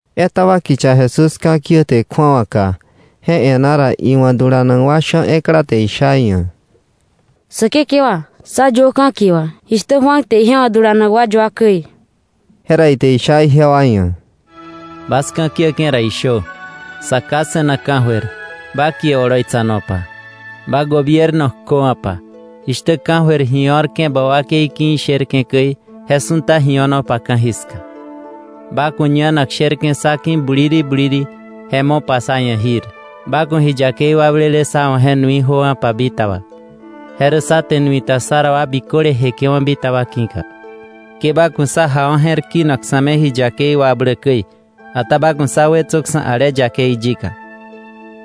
Etaba kicha Jesús ka̱ kiäte kju̱awaka. Je e̱ná ra, iwa̱ dulanak wa sha̱ ekla te isha iia̱: —Säkekewa, sá yuö ka̱kie wà jishtä Juan te ije wa̱ dulanak wa yua käi. Jera ite isha ijewa ia̱: —Bas ka̱ kiäke̱ ra, ishö: “Sa Ká se̱nak ka̱jöir, ba kie oloitsanopa. Ba gobierno kjöwa̱pa. Jishtä ka̱jöir ji o̱rke̱ ba wakei ki̱ isherke̱ käi, je su̱ta ji o̱nopa ka̱jiska. Ba ku̱ ñanak sherke̱ sá ki̱ buliri buliri, je mopa sá ia̱ jir. Ba ku̱ ji yakei wakblele sá wa̱ je nui jöwa̱pa bitaba, je rä sá te nui ta sá ra wa biköle jeke̱wa̱ bitaba ki̱ka. Ke ba ku̱ sá jawa̱ je̱r kinak sa̱ me ji yakei wakbläk käi. Ata ba ku̱ sá wetsöksa̱ ale yakei yika.”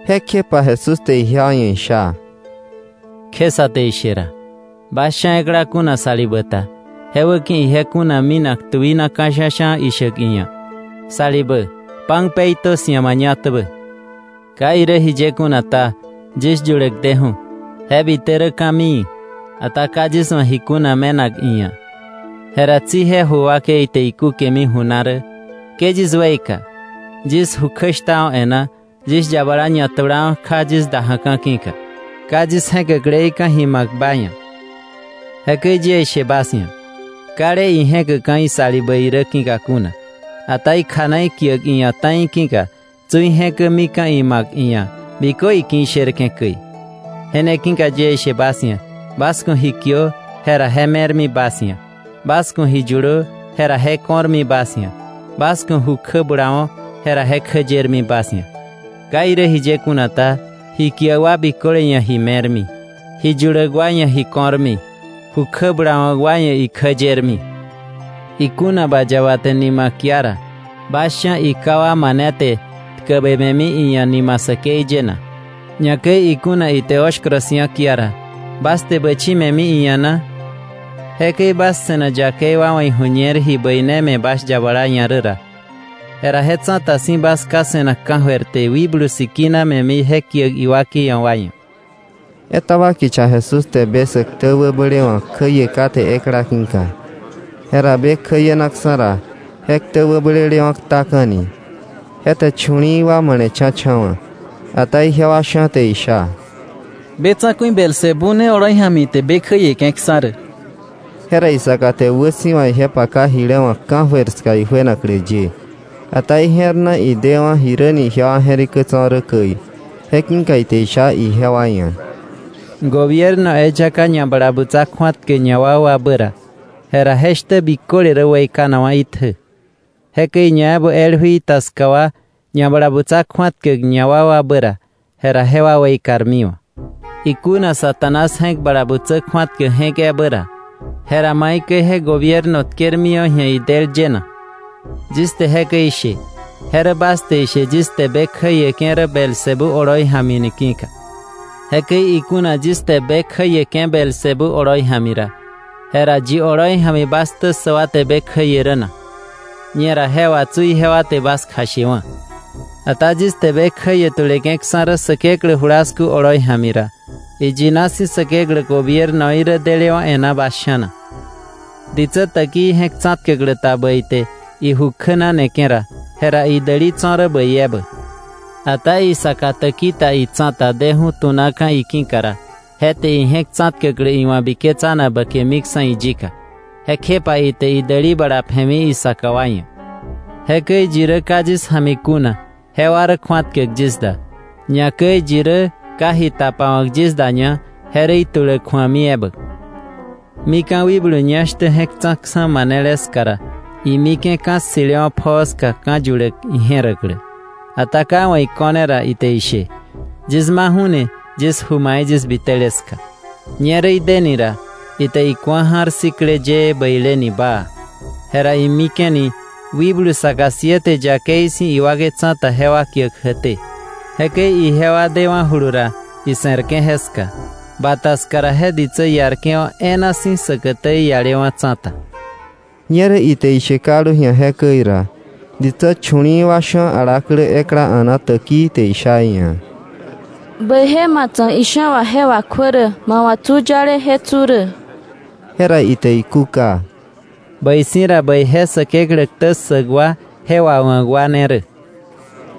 Jekjepa Jesús te ijewa ia̱ isha: —Kje sä te ishe ra, bas sha̱ ekla kuna salibä ta je wäki̱ ije kuna minak tuina ka̱ sha̱sha̱ ishäk iia̱: ‘Salibä, pan peitö 'sia̱ mañatäbä. Ka irä jiye kuna ta, yis yuläk deju̱, je bite rä ka̱mii, ata ka yis wa̱ ji kuna me̱nak iia̱.’ Jera tsi je ju wakei te ikúkemi ju na rä: ‘Ke yis weika. Yis ju kjäshtawa̱ e̱ná, yis yabala ñatulawa̱ kja yis da ja̱ka̱ ki̱ka; ka yis je̱käkleika̱ ji ma̱k ba ia̱.’ Jekäi yie ishe bas ia̱: Kale ije̱käkka̱ isalibä irä ki̱ka kuna, ata ikjana ikiäk iia̱ ta̱i ki̱ka tsi ije̱kämika̱ ima̱k iia̱ bikö iki̱ isherke̱ käi. Je ne ki̱ka yie ishe bas ia̱: Bas ku̱ ji kiö, jera je me̱rmi bas ia̱; bas ku̱ ji yulö, jera je ko̱rmi bas ia̱; bas ku̱ ju kjä bulawo̱, jera je kjä yermi bas ia̱. Ka irä jiye kuna ta, ji kiäk wa biköle ia̱ ji me̱rmi; ji yuläk wa ia̱ ji ko̱rmi; ju kjä bulawa̱k wa ia̱ ikjä yermi. “Ikuna ba yaba te nima kia ra, ¿bas sha̱ iká wa mane te tkäbe me̱mi iia̱ nima säkei ye na? Ñakäi ikuna ite oshkoro si̱a kia ra, ¿bas te bächi me̱mi iia̱ na? Jekäi bas se̱nak yakei wa wa̱ iju̱ñer ji bäine me̱ bas yabala ia̱ rä ra, jera je tsa̱ta si̱ bas Ká se̱nak ka̱jöir te Wikblu Sikina me̱mi je kiäk iwakei ia̱ wa ia̱.” Etaba kicha Jesús te be sä ktä wäblewa̱k kjäie kate ekla ki̱ka. Jera be kjäienaksa̱ ra, je ktä wäblelewa̱ ktaka̱ni. Je te chu̱li̱i̱ wa male̱cha̱cha̱wa̱. Ata ijewa sha̱ te isha: “Be tsa̱ku̱i Beelzebú ne oloi ja̱mi ite be kjäieke̱ksa̱ rä.” Jera isaka te wäsi̱wa ije paka jile wa̱k ka̱jöir ska ijuenaklä ye. Ata ije̱r na idewa̱ jiräni ijewa je̱rikä tso̱ rä käi; je ki̱ka ite isha ijewa ia̱: “Gobierno eyaka ñabalabutsa kju̱atkäk ñawakwabä ra, jera je shtä biköle rä weikanakwa̱ itjä. Jekäi ñaebä el jui ta ska wa ñabalabutsa kju̱atkäk ñawakwabä ra, jera jewa weikarmiwa̱. Ikuna Satanás je̱k bala butsä kju̱atkäk je̱k ebä ra, jera ¿maikäi je gobierno tkermiwa̱ ji̱a idël ye na? Yis te jekäi ishe, je rä bas te ishe yis te be kjäieke̱ rä Beelzebú oloi ja̱mi ni ki̱ka. Jekäi ikuna yis te be kjäieke̱ Beelzebú oloi ja̱mi ra, jera ¿yi oloi ja̱mi bas ktä ssäk wa te be kjäie rä na? Ñera je wà tsu ijewa te bas kjashewa̱. Ata yis te be kjäie tuleke̱ksa̱ rä Säkeklä julasku oloi ja̱mi ra, iyina si̱ Säkeklä gobiernoí rä delewa̱ e̱ná bas sha̱na. “Ditsä täkii je̱k tsa̱tkäklä ta bäi te iju kjänaneke̱ ra, jera idäli tso̱ rä bäi ebä. Ata isaka täki ta itsa̱ta deju̱ tu̱naka̱ iki̱ka ra, je te ije̱k tsa̱tkäklä iwa̱ biketsanak bäkemiksa̱ iyika. Jekjepa ite idäli bala pje̱mi isaka wa ia̱. “Jekäi yi rä ka yis ja̱mi kuna, jewa rä kju̱atkäk yis da. Ñakäi yi rä ka ji tapawa̱k yis daña, je rä ituläk ju̱ami ebä. “Mika̱ wikblu ñá shtä je̱k tsa̱ksa̱ manele ska ra, imike̱ ka̱ ssi̱lewa̱ pjoo ska ka̱ yuläk ije̱räklä; ata ka iwa̱ iko̱ne ra, ite ishe: ‘Yis maju̱ni yis ju mai yis bitele ska.’ Ñerä ideni ra, ite iku̱a ja̱r sikle yëë, bäileni baa. Jera imike̱ni wikblu saka siete yakei si̱ iwakei tsa̱ta jewa kiäk jäkté. Jekäi ijewa dewa̱julu ra ise̱rke̱ jeska; bata ska ra, je ditsä iarke̱wa̱ e̱e̱na si̱ säkätä iialewa̱ tsa̱ta.” Ñerä ite ishe kaldu ji̱a jekäi ra, ditsä chu̱li̱i̱ wa sha̱ alaklä ekla a̱na täkii te isha iia̱: —Bäije ma tsa̱k isha̱ wà je wakjuä rä, ma wa̱ tsu yale je tsu rä. Jera ite ikúka: —Bäi si̱ ra bäije Säkeklä ktä ssäk wa je wawa̱k wa ne rä.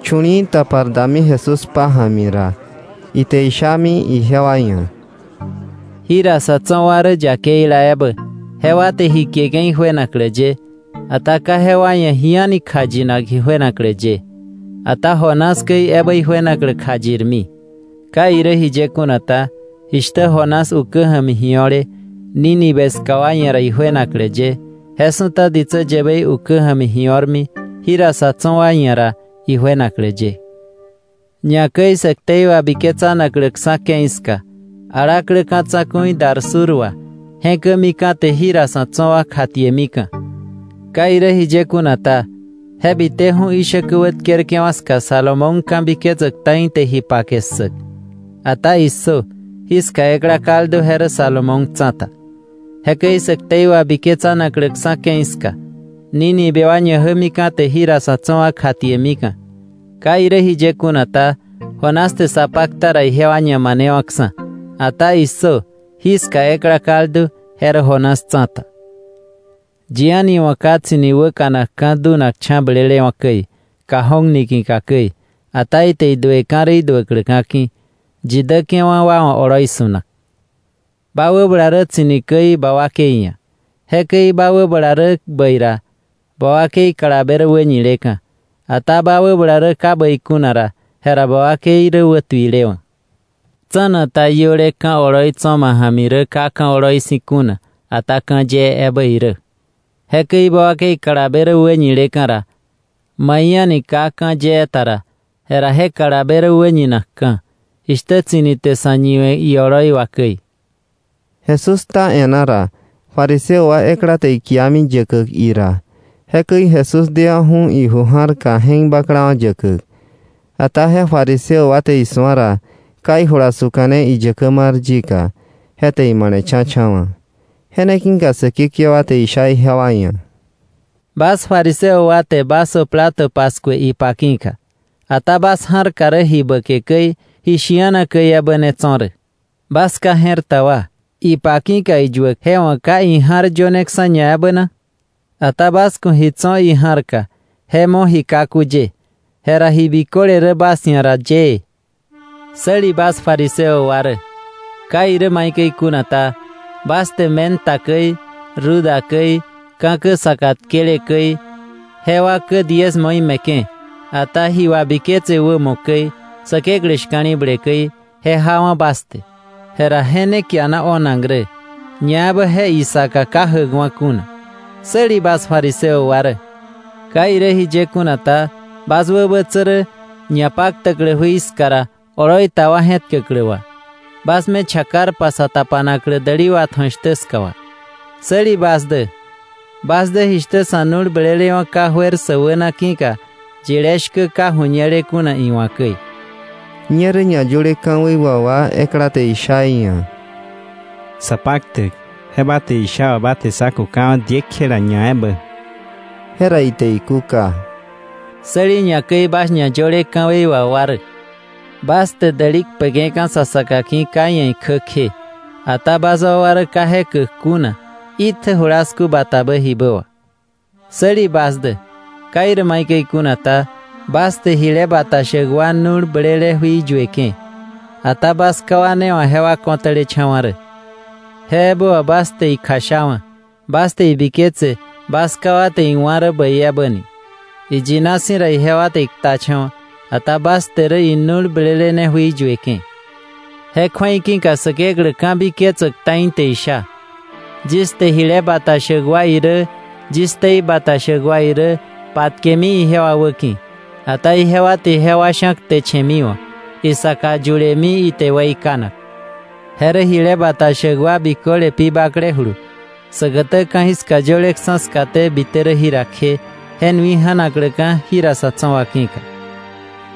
Chu̱li̱i̱ tapar dami Jesús pája̱mi ra, ite ishami ijewa ia̱: “Jira sa̱ tso̱ wa rä yakeila ebä, jewa te ji kieke̱ ijuenaklä ye. Ata ka jewa ia̱ ji a̱ni kjayinak ijuenaklä ye, ata Jonás käi ebä ijuenaklä kjayirmi. Ka irä jiye kuna ta, jishtä Jonás ukä ja̱mi ji o̱le Nínive ska wa ia̱ ra ijuenaklä ye, je su̱ta ditsä yäbei ukä ja̱mi ji o̱rmi jira sa̱ tso̱ wa ia̱ ra ijuenaklä ye. Ñakäi sä ktei wabiketsanakläksa̱ ke̱i ska, alaklä ka̱ tsa̱ku̱i dar sur wa je̱kämika̱ te jira sa̱ tso̱ wa kjatiemika̱. Ka irä jiye kuna ta, je biteju̱ ishäkä wätkerke̱wa̱ ska Salomón ka̱biketsäk ta̱i te ji pake ssäk. Ata ¡issö! Jiska ekla kaldu, je rä Salomón tsa̱ta. Jekäi sä ktei wabiketsanakläksa̱ ke̱i ska, Nínive wa ñajämika̱ te jira sa̱ tso̱ wa kjatiemika̱. Ka irä jiye kuna ta, Jonás te sa pakta ra ijewa ñamanewa̱ksa̱. Ata ¡issö! Jiska ekla kaldu, je rä Jonás tsa̱ta. “Yi a̱ni wa̱ ka tsi̱ni wäkanakka̱ dunakcha̱ blelewa̱ käi, cajón niki̱ka käi, ata ite idueka̱ rä iduäkläka̱ ki̱, yi däke̱wa̱ wa wa̱ oloi su̱nak. Ba wäbala rä tsi̱ni käi ba wakei ia̱; jekäi ba wäbala rä bäi ra, ba wakei kalabe rä wäñileka̱, ata ba wäbala rä ka bäi kuna ra, jera ba wakei rä wätuilewa̱. Tsa̱na ta iöle ka̱ oloi tso̱ ma ja̱mi rä ka ka̱ oloi si̱ kuna, ata ka̱ yee ebä irä. Jekäi ba wakei kalabe rä wäñileka̱ ra, mai a̱ni ka ka̱ yee ta ra, jera je kalabe rä wäñinakka̱, jishtä tsi̱ni te sa̱ ñiwe̱ ioloi wà käi.” Jesús kta e̱ná ra, fariseo wa ekla te ikiami yäkäk ira, jekäi Jesús dewa̱ju̱ iju ja̱rka je̱k baklawa̱ yäkäk. Ata je fariseo te isu̱a ra ka ijula suka̱ne iyäkä mar yika, je te ima̱le̱cha̱wa̱. Je ne ki̱ka Säkekewa te isha ijewa ia̱: —Bas fariseo wa te vaso plato paskue ipa ki̱ka, ata bas ja̱rka rä ji bäke käi, ji shi̱ana käi ebä ne tso̱ rä. Bas ka je̱r ta wa, ¿ipa ki̱ka iyuäk je wa̱ ka ija̱r yöneksa̱ ñaebä na? Ata bas ku̱ ji tso̱ ija̱rka je mo ji kaku ye, jera ji biköle rä bas ia̱ ra yëë. “¡Säli bas fariseo wa rä! Ka irä maikäi kuna ta, bas te menta käi, ruda käi, ka̱kä saka tkele käi, jewa kä diezmoí me̱ke̱, ata ji wabiketse wämo käi, Säkeklä shka̱li̱ble käi je jawa̱ bas te; jera je ne kiana o̱nak rä, ñaebä je isaka ka jäkwa kuna. “¡Säli bas fariseo wa rä! Ka irä jiye kuna ta, bas wäbätsä rä ñapaktäklä jui ska ra, oloi ta wa je̱tkäklä wà, bas me chakarpa sa tapanaklä däli watju̱ak shtä ska wà. “¡Säli bas dä! Bas dä jishtä sa̱ nu̱l blelewa̱ ka juer sä wäna ki̱ka yile shkä ka ju̱ñele kuna iwa̱ käi.” Ñerä ñayöle ka̱wei wà wa ekla te isha iia̱: —Sapaktäk, je ba te isha wà ba te sá kukawa̱ diekjela ñaebä. Jera ite ikúka: —¡Säli ñakäi bas ñayöle ka̱wei wà wa rä! Bas te däli kpeke̱ka̱ sa saka ki̱ ka iia̱ ikjä kje, ata bas wakwa rä ka je käk kuna itjä julasku batabä jibä wà. “¡Säli bas dä! Ka irä maikäi kuna ta, bas te jile bata shäk wa nu̱l blele jui yueke̱, ata bas ká wa ne wa̱ jewa kotälecha̱wa̱ rä. Je ebä wà bas te ikjashawa̱ bas te ibiketse bas ká wa te iwá̱ rä bäi ebä ni. Iyina si̱ ra, ijewa te iktacha̱wa̱, ata bas te rä inu̱l blele ne jui yueke̱. “Je kju̱ei ki̱ka Säkeklä ka̱biketsäk ta̱i te isha: ‘Yis te jile bata shäk wa irä, yis ktei bata shäk wa irä patkemi ijewa wäki̱. Ata ijewa te jewa sha̱ ktechemiwa̱, isaka yulemi ite weikanak.’ Je rä jile bata shäk wa biköle pi baklejulu säkätä ka̱jiska yöleksa̱ skaté bite rä jira kje, je nui ja̱nakläka̱ jira sa̱ tso̱ wa ki̱ka;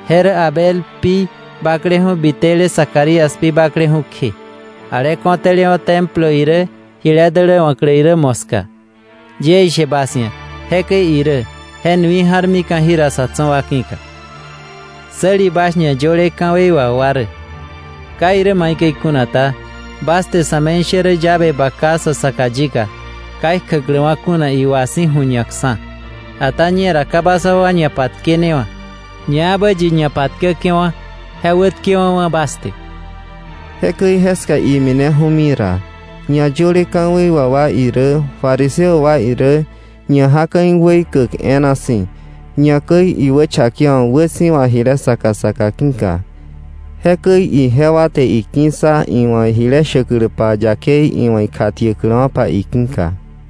je rä Abel pi bakleju̱ bite rä Zacarías pi bakleju̱ kje, ale kotälewa̱ Templo irä jile däläwa̱klä irä moska. Yie ishe bas ia̱, jekäi irä, je nui ja̱rmika̱ jira sa̱ tso̱ wa ki̱ka. “¡Säli bas ñayöle ka̱wei wà wa rä! Ka irä maikäi kuna ta, bas te sa̱me̱ishärä llave baka sa saka yika, ka ikjäkläwa̱ kuna iwa si̱ ju̱ñakksa̱. Ata ñera ka bas wakwa ñapatkenewa̱, ñaebä yi ñapatkäke̱wa̱, je wätkewa̱wa̱ bas te.” Jekäi jeska imineju̱mi ra, ñayöle ka̱wei wà wa irä fariseo wa irä ñajaka̱ iweikäk e̱e̱na si̱, ñakäi iwächakewa̱k wäsi̱wa jile saka saka ki̱ka. Jekäi ijewa te iki̱ssa iwa̱ jile shäkläpa yakei iwa̱ ikjatiäkläwa̱pa iki̱ka.